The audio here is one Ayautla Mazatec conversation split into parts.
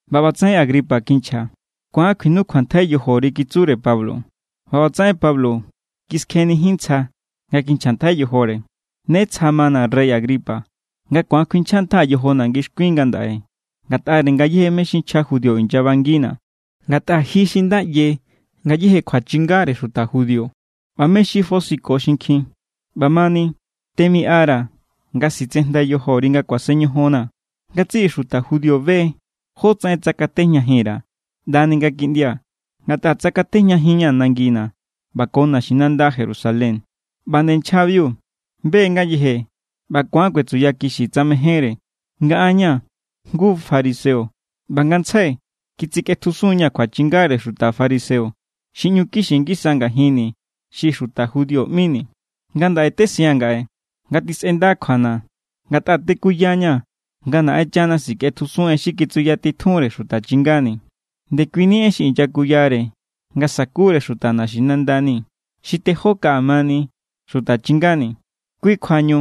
ꞌBa ꞌbatsaꞌen Agripa kinchja: —Ku̱an kjuinukjuantjai yojori —kitsure Pablo. ꞌBa ꞌbatsaꞌen Pablo kiskjenijin ntsja nga kinchjantjai yojore: —Ne tsja mana̱, rey Agripa, nga ku̱an kuinchjantjaa̱ yojona̱ ngixkuin ngandaꞌe ngatꞌare ngayéje mé= xi nchja judío inyabangina̱. Ngatꞌa ji xi nda ꞌye ngayéje kjuachingare xuta judío ꞌba mé= xi fosiko xinkjin. ꞌBamani, temiꞌara̱ nga sitsejndai yojori nga kuasen ñojonnaa̱. ’Ngatsiꞌi xuta judío be= jótsaꞌen tsakatejñajin_ra̱ ꞌndani nga kiꞌndia̱, ngatꞌa tsakatꞌejñajinña̱ nangina̱ ꞌba ko naxinanda Jerusalén. ꞌBa nde nchjabiu be= ngayeje ꞌba ku̱an kuetsuyakixi tsa mejénre, nga an ña̱ jngu fariseo ꞌba ngantsjai kitsikꞌetjusun=ña̱ kjuachingare xuta fariseo xi ꞌñu kixi ngisa ngajinni̱ xi xuta judío ꞌmini̱. ’Ngandaꞌe tesiaa̱n ngaꞌe nga tisꞌenda kjuana̱ ngatꞌa tekuyaña̱ nga Naꞌenchana sikꞌetjusun en xi kitsuyatitjunre xuta chingani̱. Ndekuini en xi inyakuyare nga sa̱kure xuta naxinandani̱, xi tejó kaꞌa mani xuta chingani̱. Kui kjuañu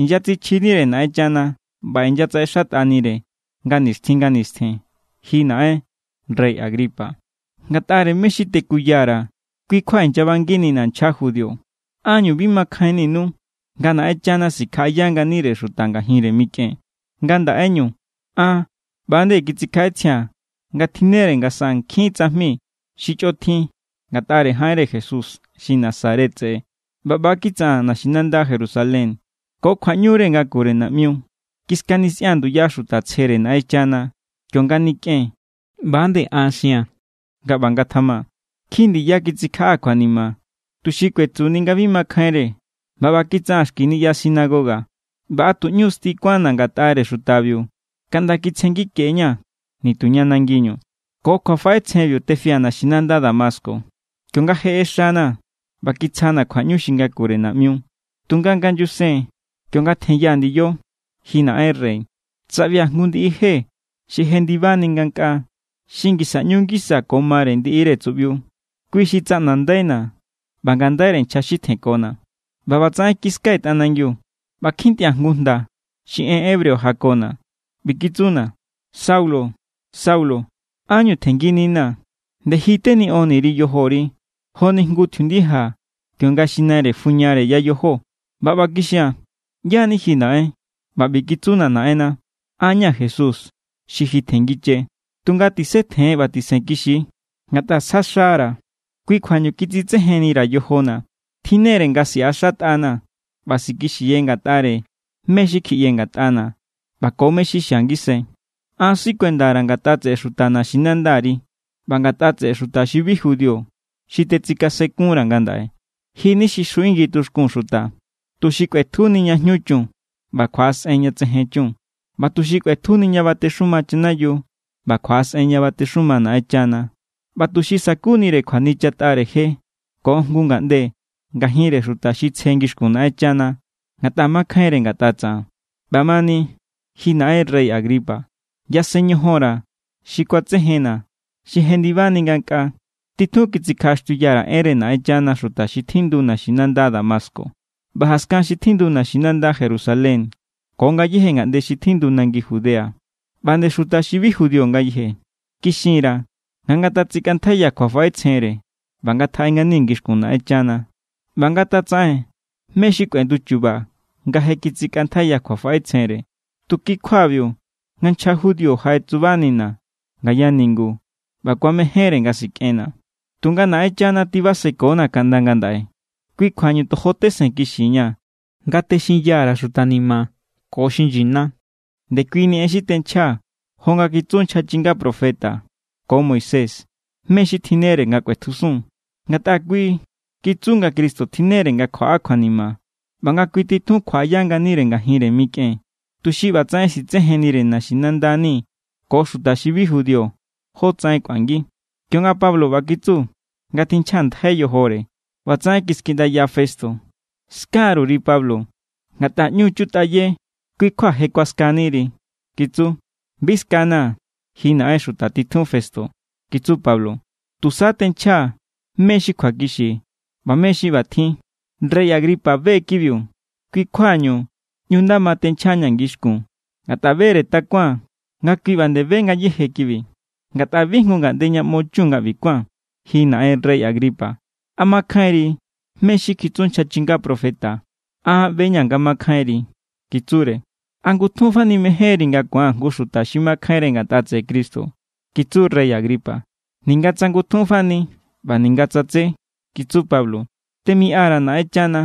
inyatsichjinire Naꞌenchana ꞌba inyatsaꞌexatꞌanire nga nixtjin nga nistjen. Ji naꞌen rey Agripa, ngatꞌare mé= xi tekuya_ra̱= kui= kjua inyabangina̱ nchja judío. ¿Ánñu bi makjainninu nga Naꞌenchana sikjaꞌaya nganire xuta ngajinre mikꞌen? ’Nga ndaꞌeñu, an ꞌba=nde kitsikjaꞌetsjia̱n nga tjinnere nga saꞌaa̱n nkjin tsajmi xi chꞌotjin ngatꞌare jaꞌenre Jesús xi Nazaret tseꞌe. ꞌBa ꞌba= kitsaꞌaa̱n naxinanda Jerusalén. Ko kjuaꞌñure ngakure naꞌmiu, kiskanisꞌia̱n nduya xuta tsjere Naꞌenchana. Kionga nikꞌen, ꞌba nde an xia̱n nga ꞌba ngatjama. Nkjin ndiya kitsikjaꞌaa̱ kjuanima, tuxi kuetsuni nga bi makjainre. ꞌBa ꞌba kitsaꞌaa̱n xki niꞌya sinagoga. ꞌBa a tu ꞌñu sti kuánna̱ ngatꞌare xutabiu kaꞌnda kitsjengike=ña̱ nituña nangiñu. Ko kjuafaꞌetsjenbiu tefia̱ naxinanda Damasco, kionga je ꞌexana̱ ꞌba kitsjana̱ kjuaꞌñu xi ngakure naꞌmiu. Tunga nga nyusen kionga tjenyaa̱ ndiyo, ji naꞌen rey, tsaꞌbia̱ jngu ndiꞌi je xi jendibani ngankꞌaa, xi ngisa ꞌñu ngisa ko mare ndiꞌire tsuꞌbiu. Kui xi tsaꞌnandaina̱ ꞌba ngandaire nchja xi tjenkona̱. ꞌBa ꞌbatsaꞌen kiskai̱ tꞌanangiu ꞌba kjintꞌia̱ jngu jnda xi en hebreo jakona̱. ꞌBi kitsuna̱: “Saulo, Saulo, ¿ánñu tjenngininaa̱? Nde ji teniꞌonniri yojori, joni jngu tjiundija kionga xi naire fuñare yayojo.” ’ꞌBa ꞌba kixia̱n: “¿ꞌYá= ni ji, Naꞌen?” ꞌBa ꞌbi kitsuna̱ Naꞌenna: “An= ña̱ Jesús, xi ji tjenngiche. Tunga tisetjen ꞌba tisenkixi. Ngatꞌa sjaxa=ra̱, kui= kjuañu kitsitsejennira̱ yojona̱. Tjinnere nga siꞌaxatꞌanaa̱ ꞌba sikixiye ngatꞌare mé= xi kjiꞌye ngatꞌana̱ ꞌba ko mé= xi xia ngisai. An sikuendara̱ ngatꞌa tseꞌe xuta naxinandari ꞌba ngatꞌa tseꞌe xuta xi bi judío xi tetsikasenkunra̱ ngandaꞌe. Ji= ni xi xjuꞌingi tuxkun xuta, tuxi kꞌuetjuni ña jñu chun ꞌba kjuaꞌasꞌen ña tsejen chun, ꞌba tuxi kꞌuetjujinni ña batexuma chanayiu ꞌba kjuaꞌasꞌen ña batexuma Naꞌenchana, ꞌba tuxi sa̱kunire kjuanichatꞌare jere ko jngu ngaꞌnde ngajinre xuta xi tsje ngixkun Naꞌenchana ngatꞌa makjainre ngatꞌa tsaꞌan.” ’ꞌBamani, ji naꞌen rey Agripa, yasen ñojon_ra̱ xi kuatsejenna̱ xi jendibani ngankꞌaa. Titjun kitsikjaꞌaxtiuya_ra̱ enre Naꞌenchana xuta xi tjindu naxinanda Damasco ꞌba jaskan xi tjindu naxinanda Jerusalén ko ngayéje ngaꞌnde xi tjindu nangi Judea ꞌba nde xuta xi bi judío ngayeje. Kixin_ra̱ nga ngatatsikꞌantjaiya kjuafaꞌetsjenre ꞌba ngatjaꞌe ngani ngixkun Naꞌenchana ꞌba ngatatsaꞌen mé= xi kꞌuenduchuba nga je kitsikꞌantjaiya kjuafaꞌetsjenre. Tu kui= kjuabiu nga nchja judío jaꞌetsubanina̱ ngaya ningu ꞌba kuamejénre nga sikꞌenna̱. ’Tunga Naꞌenchana tibasekona̱ kaꞌnda ngandaꞌe. Kui= kjuañu tojo tesenkixiña̱ nga texinya_ra̱ xuta ni̱ma̱ ko xi nyina. Ndekuini en xi tenchjaa̱ jo nga kitsu nchja chinga profeta ko Moisés, mé= xi tjinnere nga kꞌuetjusun. Ngatꞌa kui kitsu nga Cristo tjinnere nga kjuaꞌa kjuanima ꞌba nga kui titjun kjuaꞌaya nganire ngajinre mikꞌen, tuxi ꞌbatsaꞌen sitsejennire naxinandani̱ ko xuta xi bi judío jotsaꞌen kꞌuangi. Kionga Pablo ꞌba kitsu nga tinchjantjai yojore, ꞌbatsaꞌen kiskiꞌndaya Festo: —¡Skaruri, Pablo! Ngatꞌa ꞌñu= chutꞌaye, kui= kjua je kuaskaniri —kitsu. —Bi skana̱, ji naꞌen xuta titjun Festo —kitsu Pablo—. Tusa tenchjaa̱ mé= xi kjuakixi ꞌba mé= xi ꞌbatjin. Rey Agripa be= kibiu. Kui= kjua ꞌñu nda ma tenchjaa̱ña̱ ngixkun. Ngatꞌa bere takuaa̱n nga kui ꞌba nde be ngayéje kibi. Ngatꞌa bi jngu ngaꞌnde ña ꞌmo chun nga ꞌbi kuán. Ji naꞌen rey Agripa, ¿a makjainri mé= xi kitsu nchja chinga profeta? An ꞌbe=ña̱ nga makjainri —kitsure. —¿A ngutjun fani mejénri nga ku̱an jngu xi makjainre ngatꞌa tseꞌe Cristo? —kitsu rey Agripa. —Ninga tsa ngutjun fani ꞌba ninga tsa tsé —kitsu Pablo—, temiꞌa_ra̱ Naꞌenchana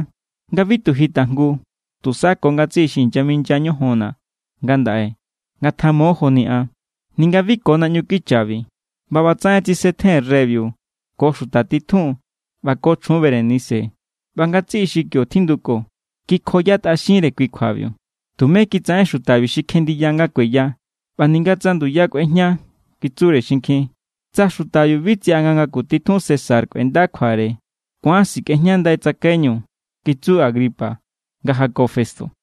nga bi tu ji tajngu, tusa ko ngatsiꞌi xi inyaminya ñojonna̱ ngandaꞌe ngatamo joni an, ninga bi ko naꞌñu kichabi. ꞌBa ꞌbatsaꞌen tsisetjen reybiu ko xuta titjun ꞌba ko chjun Berenice ꞌba ngatsiꞌi xi kio tjinduko. Kikjoyatꞌaxinre kui kjuabiu. —Tumé kitsaꞌen xutabiu xi kjenndiya nga kueya ꞌba ninga tsa nduya kꞌuejña —kitsure xinkjin. —Tsa xutabiu bi tsiꞌa nga ngaku titjun César kꞌuenda kjuare, ku̱an sikꞌejñandai tsakaiñu —kitsu Agripa nga jako Festo.